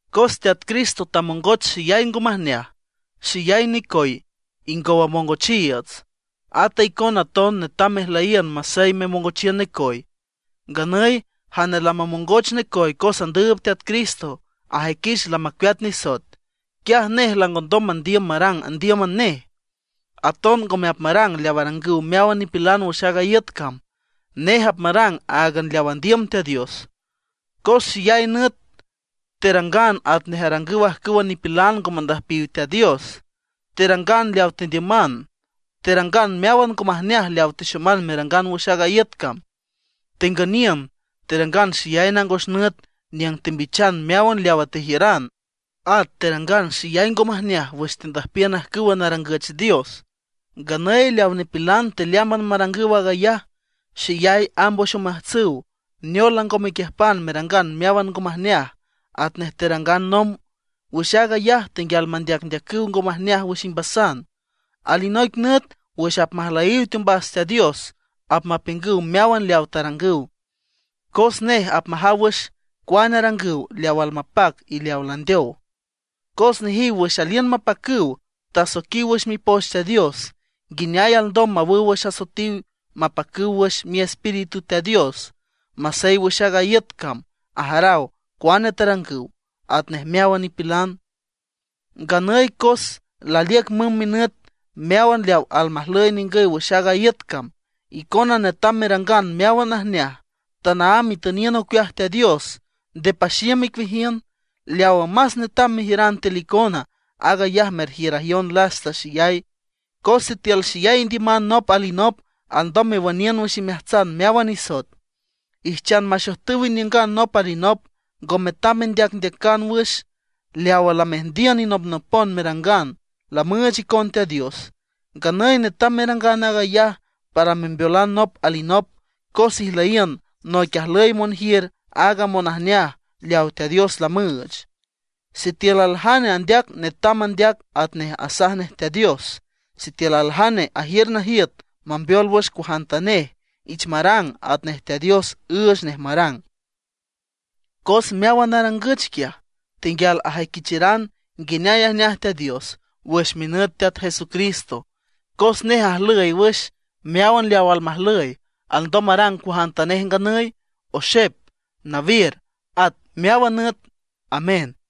Cos Teat Cristo tamongoch xeyay ngo majneaj, xeyay necoy ingow amongochiiüts; ata icona aton netam mejlüyíünan masey memongochiün necoy. Nganüy jane lamamongoch necoy cos andüüb Teat Cristo, ajüiquich lamacueat nisoet. Quiaj nej langondom mandiüm marang andíüman nej, aton ngome apmarang leaw arangüw meáwan nipilan wüx aaga iüt cam. Nej apmarang áagan leaw andiüm Teat Dios. Cos xeyay nüt terangan atnej arangüw ajcüwa nipilan ngo mandüjpiw Teat Dios. Terangan leaw tendiüman; terangan meáwan ngo majneaj leawa texoman merangan wüx aaga iüt cam: tengüniün, terangan xeyay nangos nüt niüng tembichan meáwan leawa tejiüran, at terangan xeyay ngo majneaj wüx tendüjpiün ajcüwa narangüch dios. Nganüy leawa nipilan tealeámban marangüw aag ayaj, xeyay amb wüx omeajtsüw neol lango mequiüjpan merangan meáwan ngo majneaj atnej terangan nomb. Wüx aag ayaj tenguial mandeacndeacüw ngo majneaj wüx imbasan. Alinoic nüt wüx apmajlüjyiw teombas Teat Dios apmapiüngüw meáwan leawa tarangüw; cos nej apmajaw wüx cuane arangüw leaw almapac y leawa landeow. Cos nejiw wüx aliün mapacüw tasoiquiw wüx Mipoch Teat Dios, nguineay alndom mawüw wüx asoetiw mapacüw wüx miespíritu Teat Dios. Masey wüx aaga iüt cam ajaraw cuane tarangüw, atnej meáwan nipilan. Nganüy cos laliüc mümb minüt meáwan leaw almajlüy ningüy wüx aaga iüt cam; icona netam merangan meáwan najneaj, tanaámb itüniün ocueaj Teat Dios, nde paxiüm icueajiün. Leawa más netam mejiüran tiül icona, aag ayaj merjiürayon lasta xeyay, cos sitiül xeyay indiüman nop alinop alndom mewüniün wüx imeajtsan meáwan nisoet. Ijchan maxojtüw iniüngan nop alinop, ngo metam mendeacndeacan wüx. Leawa lameajndiün inopnopon merangan, lamüüch icon Teat Dios, nganüy netam merangan aag ayaj para membeolan nop alinop, cos ijlüyiün noic ajlüy monjiür aaga monajneaj leawa Teat Dios lamüüch. Sitiül aljane andeac, netam mandeac atnej asaj nej Teat Dios. Sitiül aljane ajiür najiüt mambeol wüx cuajantanej, ich marang atnej Teat Dios üüch nej marang. Cos meáwan narangüch quiaj, tenguial ajüiquicharan nguineay ajneaj Teat Dios wüx minüt Teat Jesucristo, cos nej ajlüy wüx meáwan leaw almajlüy; alndom marang cuajantanej nganüy, oxep, nawiür, at meáwan nüt. Amén.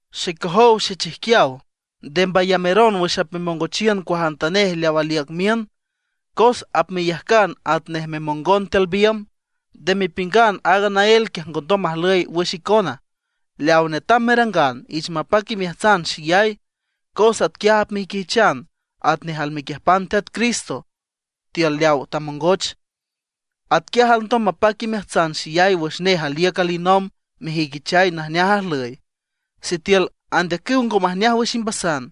Xecojow xechijquiaw, nde mbayameron wüx apmemongochiün cuajantanej leaw aliüc miün, cos apmeyajcan atnej memongon tiül biümb. Nde mepiüngan aag naél quiaj ngondom majlüy wüx icona. Leaw netam merangan, ich mapac imeajtsan xeyay, cos atquiaj apmejüiquichan atnej almequiüjpan Teat Cristo tiül leaw tamongoch. Atquiaj alndom mapac imeajtsan xeyay wüx nej aliüc alinomb mejüiquichay najneajay ajlüy. Sitiül andeacüw ngo majneaj wüx imbasan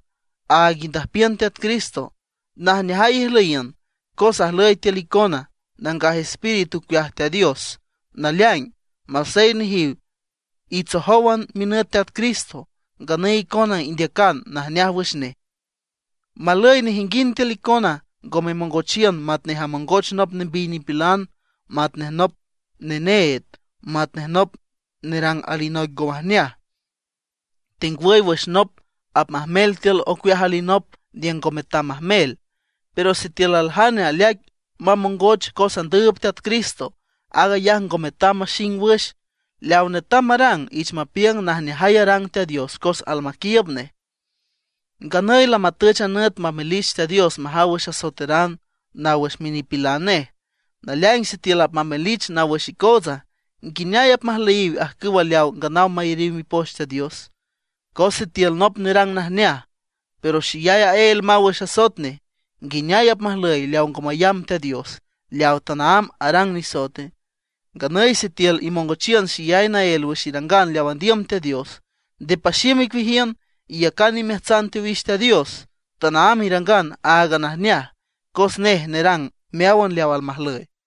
áag indüjpiün Teat Cristo, najneajay ijlüyiün, cos ajlüy tiül icona Nangaj Espíritu ocueaj Teat Dios. Naleaing, masey nejiw itsojówan minüt Teat Cristo, nganüy icona indeacan najneaj wüx nej. Malüy nejinguind tiül icona ngo memongochiün matnej amongoch nop nembiy nipilan, matnej nop neneed, matnej nop nerang alinoic ngo majneaj, tengwüy wüx nop apmajmel tiül ocueaj alinop niüng ngo metam majmel. Pero sitiül aljane aleaic mamongoch cos andüüb Teat Cristo, aag ayaj ngo metam maxing wüx; leaw netam marang, ich mapiüng najneajay arang Teat Dios cos almaquiiüb nej. Nganüy lamatüch a nüt mamelich Teat Dios majaw wüx asoeteran naw wüx minipilan nej. Naleaing sitiül apmamelich naw wüx icootsa, ¿nguineaye apmajlüyiwe ajcüwa leaw nganaw mayariw Mipoch Teat Diosa? Cos sitiül nop nerang najneaj, pero xeyay aél maw wüx asoet nej, ¿nguineay apmajlüye leaw ngo mayamb Teat Diosa, leaw tanaámb arang nisoete? Nganüy sitiül imongochiün xeyay naél wüx irangan leaw andiüm Teat Dios, nde paxiüm icueajiün; iyacan imeajtsan teowix Teat Dios, tanaámb irangan áagan najneaj cos nej nerang meáwan leaw almajlüy.